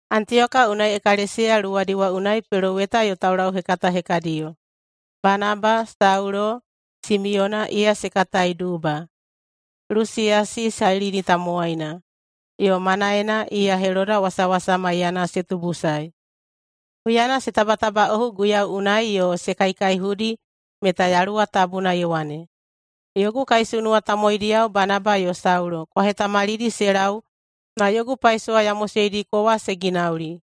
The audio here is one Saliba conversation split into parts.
Antiyoka unai ekalesiya luwadi wa unai peloweta yo taulauhekata hekadiyo: Banaba, Saulo, Simiyona, iya se katai Duba, Lusiyasi Sailini tamowaina, yo Manaen, iya Heloda wasawasa maiyana se tubusae. Huyana se tabatabaꞌohu Guiyau unai yo se kaikaihudi meta Yaluwa Tabuna ye wane, “Yogu kaisunuwa tamowaidiyao Banaba yo Saulo kwa hetamalidi se lau na yogu paisowa ya moseidiko wa se ginauli.”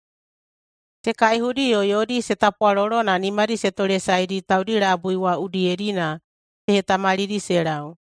Se kaihudi yo yodi se tapwalolo na nimadi se tolesaedi taudi labui wa udiyedi na se hetamalidi se lau.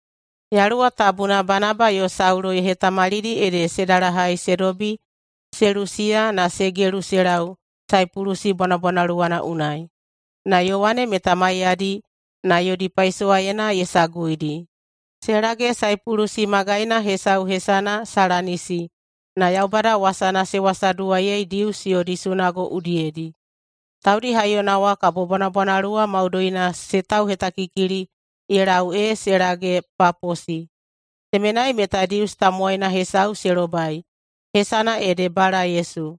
Yaluwa Tabuna Banaba yo Saulo ye hetamalidi ede se dalahai se dobi Selusiya na se gelu se lau Saipulusi bwanabwanaluwana unai. Na Yowane meta maiyadi na yodi paisowaena ye saguidi. Se lage Saipulusi magaina hesau hesana Salamisi, na Yaubada wasana se wasaduwaiyei Dius yodi sunago udiyedi. Taudi haiyona wa kabo bwanabwanaluwa maudoina se tauhetakikili ye lau ee se lage Paposi. Temenai meta Dius tamowaina hesau se lobai hesana ede Bala-Yesu.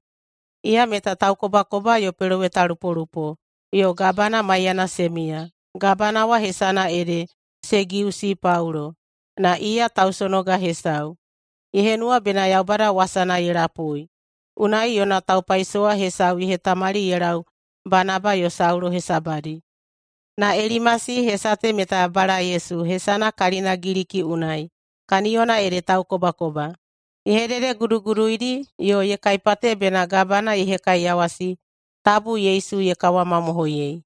Iya meta taukobakoba yo pelowetalupolupo, yo gabana maiyana se miya. Gabana wa hesana ede Segiusi Paulo, na iya tausonoga hesau. Ye henuwa bena Yaubada wasana ye lapui, unai yona taupaisowa hesau ye hetamali ye lau Banaba yo Saulo hesabadi. Na Elimasi – hesa te meta Bala-Yesu hesana kalina Giliki unai, kaniyona ede taukobakoba – ye hededeguduguduidi yo ye kaipate bena gabana ye hekaiyawasi tabu Yesu ye kawamamohoiyei.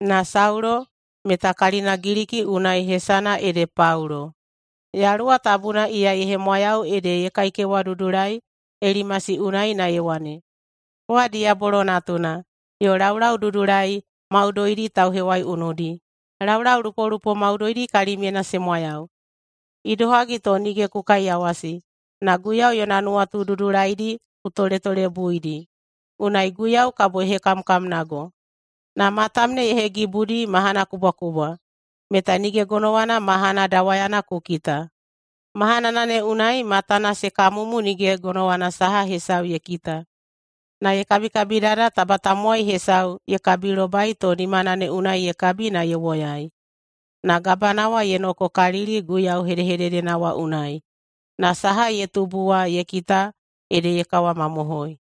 Na Saulo, meta kalina Giliki unai hesana ede Paulo, Yaluwa Tabuna iya ye hemwayau ede ye kaikewadudulai Elimasi unai na ye wane, “Kowa diyabolo natuna, yo laulaududulai maudoidi tauhewaiunudi. Laulaulupolupo maudoidi kalimyena se mwayau. Idohagi to nige ku kaiyawasi na Guiyau yona nuwatu dudulaidi ku toletolebuidi? Unai Guiyau kabo ye hekamkamnago, na matam ne ye hegibudi mahana kubwakubwa, meta nige gonowana mahana dawayana ku kita.” Mahanana ne unai matana se kamumu nige gonowana saha hesau ye kita, na ye kabikabidada taba tamowai hesau ye kabilobai to nimana ne unai ye kabi na ye woyai. Na gabana wa ye nokokalili Guiyau hedehededena wa unai, na saha ye tubu wa ye kita, ede ye kawamamohoi.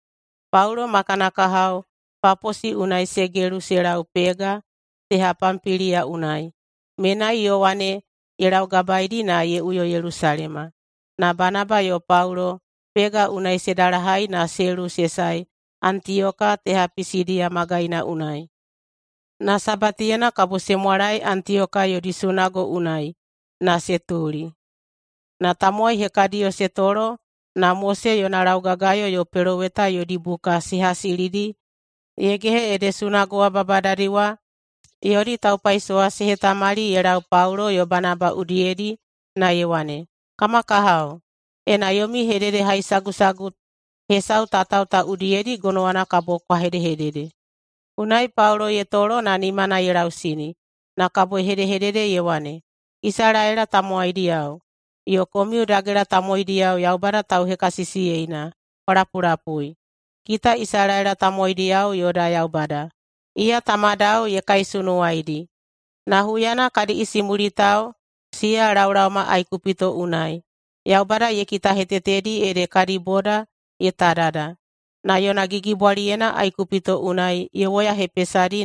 Paulo ma kana kahao Paposi unai se gelu se lau Pega teha Pampiliya unai. Menai, Yowane ye laugabaeidi na ye uyo Yelusalema. Na Banaba yo Paulo Pega unai se dalahai na se luwu se sae Antiyoka teha Pisidiya magaina unai. Na Sabatiyena kabo se mwalae Antiyoka yodi sunago unai na se tuli. Na tamowai hekadiyo se tolo na Mose yona laugagayo yo peloweta yodi buka se hasilidi ye gehe ede sunago wa babadadi wa yodi taupaisowa se hetamali ye lau Paulo yo Banaba udiyedi na ye wane, “Kama kahao, ena yomi hededehaisagusagu hesau tatao ta udiyedi, gonowana kabo kwa hedehedede.” Unai Paulo ye tolo na nimana ye lausini na kabo ye hedehedede ye wane, “Isalaela tamowaidiyao yo komiu dagela tamowaidiyao Yaubada tauhekasisiyeina, kwa lapulapui. Kita Isalaela tamowaidiyao yoda Yaubada, iya tamadao ye kaisunuwaidi. Na huyana kadi isimulitao siya laolaoma Aikupito unai, Yaubada ye kitahetetedi ede kadi boda ye tadada. Na yona gigibwaliyena Aikupito unai ye woyahepesadi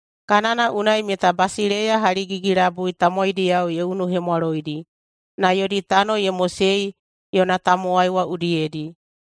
Kanana unai meta basileiya haligigi-labui tamowaidiyao ye unuhemwaloidi na yodi tano ye mosei yona tamowai wa udiyedi.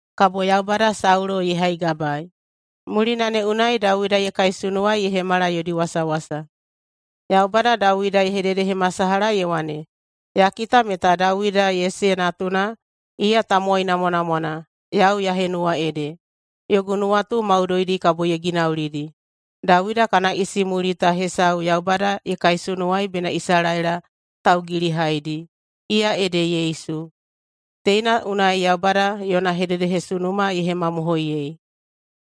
kabo Yaubada Saulo ye haigabaei. Mulina ne unai Dawida ye kaisunuwaei ye hemala yodi wasawasa. Yaubada Dawida ye hededehemasalaha ye wane, ‘Ya kita meta Dawida, Yese natuna, iya tamowai namwanamwana yau ya henuwa ede. Yogu nuwatu maudoidi kabo ye ginaulidi.’ Dawida kana isimulita hesau Yaubada ye kaisunuwai bena Isalaela taugilihaidi, iya ede Yesu. Teina unai Yaubada yona hededehesunuma ye hemamohoiyei.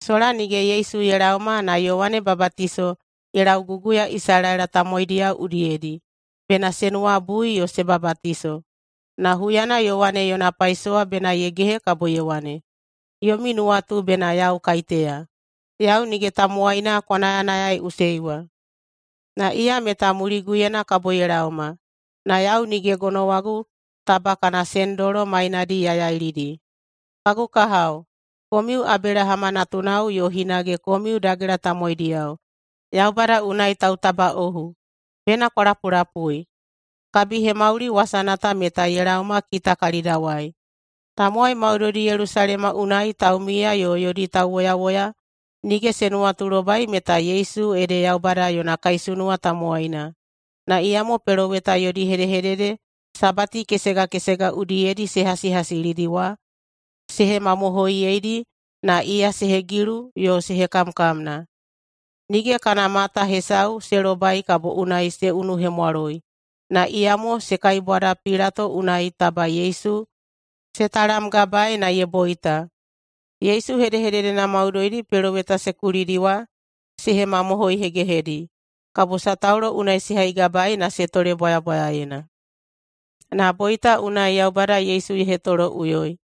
Sola nige Yesu ye laoma na Yowane Babatiso ye lauguguya Isalaela tamowaidiyao udiyedi bena se nuwabui yo se babatiso. Na huyana Yowane yona paisowa bena ye gehe kabo ye wane, ‘Yomi nuwatu bena yau kaiteya? Yau nige tamowaina kwa nayanayaiꞌusei wa. Na iya meta muliguyena kabo ye laoma, na yau nige gonowagu taba kana sendolo mainadi ya yailidi.’ Kagu kahao, komiu Abelahama natunao yo hinage komiu dagela tamowaidiyao Yaubada unai tautabaꞌohu, bena kwa lapulapui, kabihemauli wasana ta meta ye laoma kita kalidawai. Tamowai maudoidi Yelusalema unai taumiya yo yodi tauwoyawoya nige se nuwatulobai meta Yesu ede Yaubada yona kaisunuwa tamowaina, na iyamo peloweta yodi hedehedede Sabati kesega kesega udiyedi se hasihasilidi wa se hemamohoiyeidi na iya se hegilu yo se hekamkamna. Nige kana mata hesau se lobai kabo unai se unuhemwaloi, na iyamo se kaibwada Pilato unai taba Yesu ye talamgabaei na ye boita. Yesu hedehededena maudoidi peloweta se kulidi wa se hemamohoihegehedi, kabo sataulo unai se haigabaei na se tole bwayabwayaena. Na boita unai Yaubada Yesu ye hetoloꞌuyoi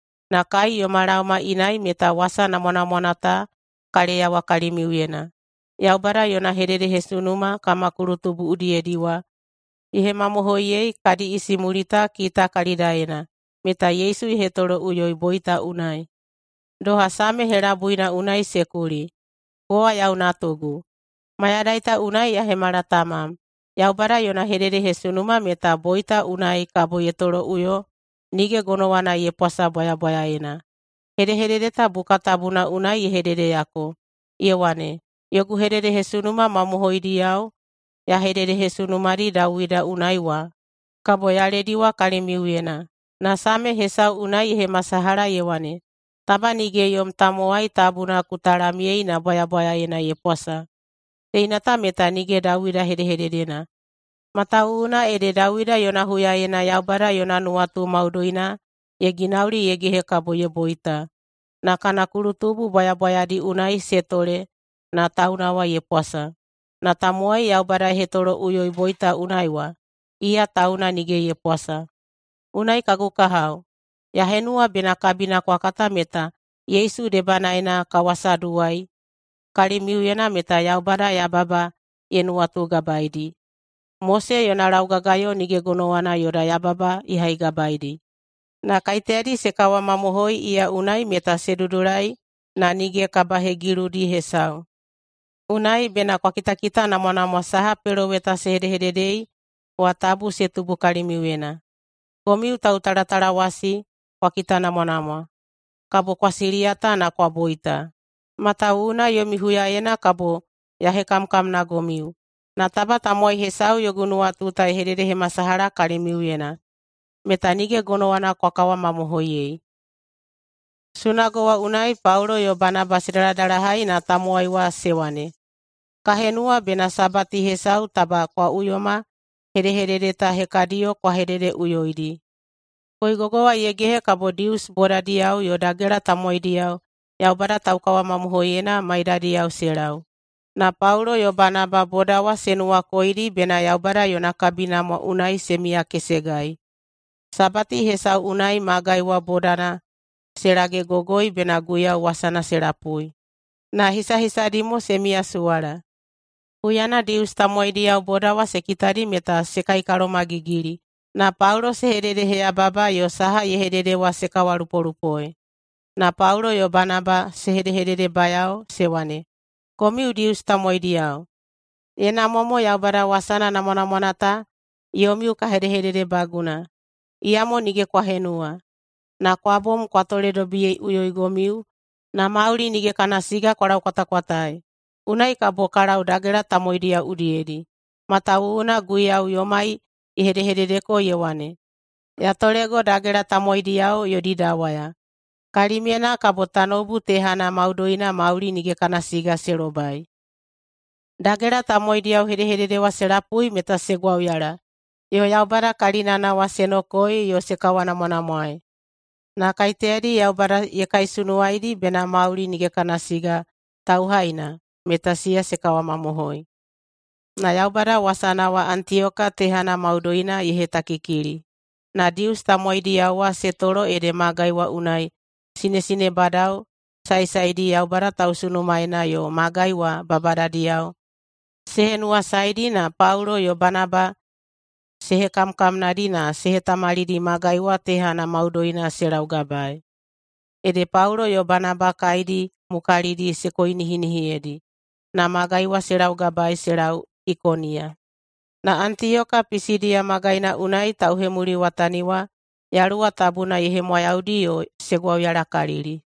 Na kai yoma laoma inai meta wasa namwanamwana ta ka leyawa kalimiuyena: Yaubada yona hededehesunuma kama kulutubu udiyedi wa ye hemamohoiyei kadi isimulita kita kalidaena meta Yesu ye hetoloꞌuyoi boita unai. Doha Same helabuina unai se kuli, ‘Kowa yau natugu, mayadai ta unai ya hemala tamam.’ Yaubada yona hededehesunuma meta boita unai kabo ye toloꞌuyo nige gonowana ye pwasa bwayabwayaena. Hedehedede ta buka tabuna unai ye hededeyako, ye wane, ‘Yogu hededehesunuma mamohoidiyao ya hededehesunumadi Dawida unai wa kabo ya lediwa kalimiuyena.’ Na Same hesau unai ye hemasalaha ye wane, ‘Taba nige yom tamowai tabuna ku talamyei na bwayabwayaena ye pwasa.’ Teina ta meta nige Dawida hedehededena, matawuwuna ede Dawida yona huyaena Yaubada yona nuwatu maudoina ye ginauli ye gehe kabo ye boita, na kana kulutubu bwayabwayadi unai se tole na tauna wa ye pwasa. Na tamowai Yaubada ye hetoloꞌuyoi boita unai wa, iya tauna nige ye pwasa. Unai, kagu kahao, ya henuwa bena kabina kwa kata meta Yesu debanaena ka wasaduwai kalimiuyena meta Yaubada yababa ye nuwatugabaedi. Mose yona laugagayo nige gonowana yoda yababa ye haigabaedi. Na kaiteyadi se kawamamohoi iya unai meta se dudulai na nige kabahegiludi hesau. Unai, bena kwa kitakitanamwanamwa saha peloweta se hedehededei wa tabu se tubu kalimiuyena: ‘Komiu tautalatalawasi, kwa kitanamwanamwa, kabo kwa siliyata na kwa boita, matawuwuna yomi huyaena kabo ya hekamkamnagomiu, na taba tamowai hesau yogu nuwatu ta ye hededehemasalaha kalimiuyena, meta nige gonowana kwa kawamamohoiyei.’” Sunago wa unai Paulo yo Banaba se daladalahai na tamowai wa se wane, “Ka henuwa bena Sabati hesau taba kwa uyoma hedehedede ta hekadiyo kwa hededeꞌuyoidi.” Koigogo wa ye gehe kabo Dius bodadiyao yo dagela tamowaidiyao Yaubada taukawamamohoiyena maiyadiyao se lau. Na Paulo yo Banaba boda wa se nuwakoidi bena Yaubada yona kabinamwa unai se miyakesegai. Sabati hesau unai magai wa bodana se lagegogoi bena Guiyau wasana se lapui, na hisahisadi mo se miyasuwala. Huyana Dius tamowaidiyao boda wa se kitadi meta se kaikalomagigili na Paulo se hededeheyababa yo saha ye hedede wa se kawalupolupoei. Na Paulo yo Banaba se hedehededebayao se wane, “Komiu Dius tamowaidiyao, ye namwa mo Yaubada wasana namwanamwana ta yomiu ka hedehededebaguna. Iyamo nige kwa henuwa, na kwa bom kwa toledobiyeiꞌuyoigomiu na mauli nige kana siga kwa laukwatakwataei. Unai kabo ka lau dagela tamowaidiyao udiyedi. Matawuwuna Guiyau yomai ye hedehededeko ye wane, ‘Ya tolego dagela tamowaidiyao yodi dawaya, kalimyena kabo tanoubu tehana maudoina mauli nige kana siga se lobai.’” Dagela tamowaidiyao hedehedede wa se lapui meta se gwauyala yo Yaubada kalinana wa se nokoei yo se kawanamwanamwaei. Na kaiteyadi Yaubada ye kaisunuwaidi bena mauli nige kana siga tauhaina, meta siya se kawamamohoi. Na Yaubada wasana wa Antiyoka tehana maudoina ye hetakikili. Na Dius tamowaidiyao wa se tolo ede magai wa unai sinesinebadao saesaedi Yaubada tausunumaena yo magai wa babadadiyao se henuwasaedi na Paulo yo Banaba se hekamkamnadi na se hetamalidi magai wa tehana maudoina se laugabaei. Ede Paulo yo Banaba kaedi mukalidi se koinihinihiyedi, na magai wa se laugabaei se lau Ikoniya. Na Antiyoka Pisidiya magaina unai tauhemuliwatani wa Yaluwa Tabuna ye hemwayaudi yo se gwauyalakalili.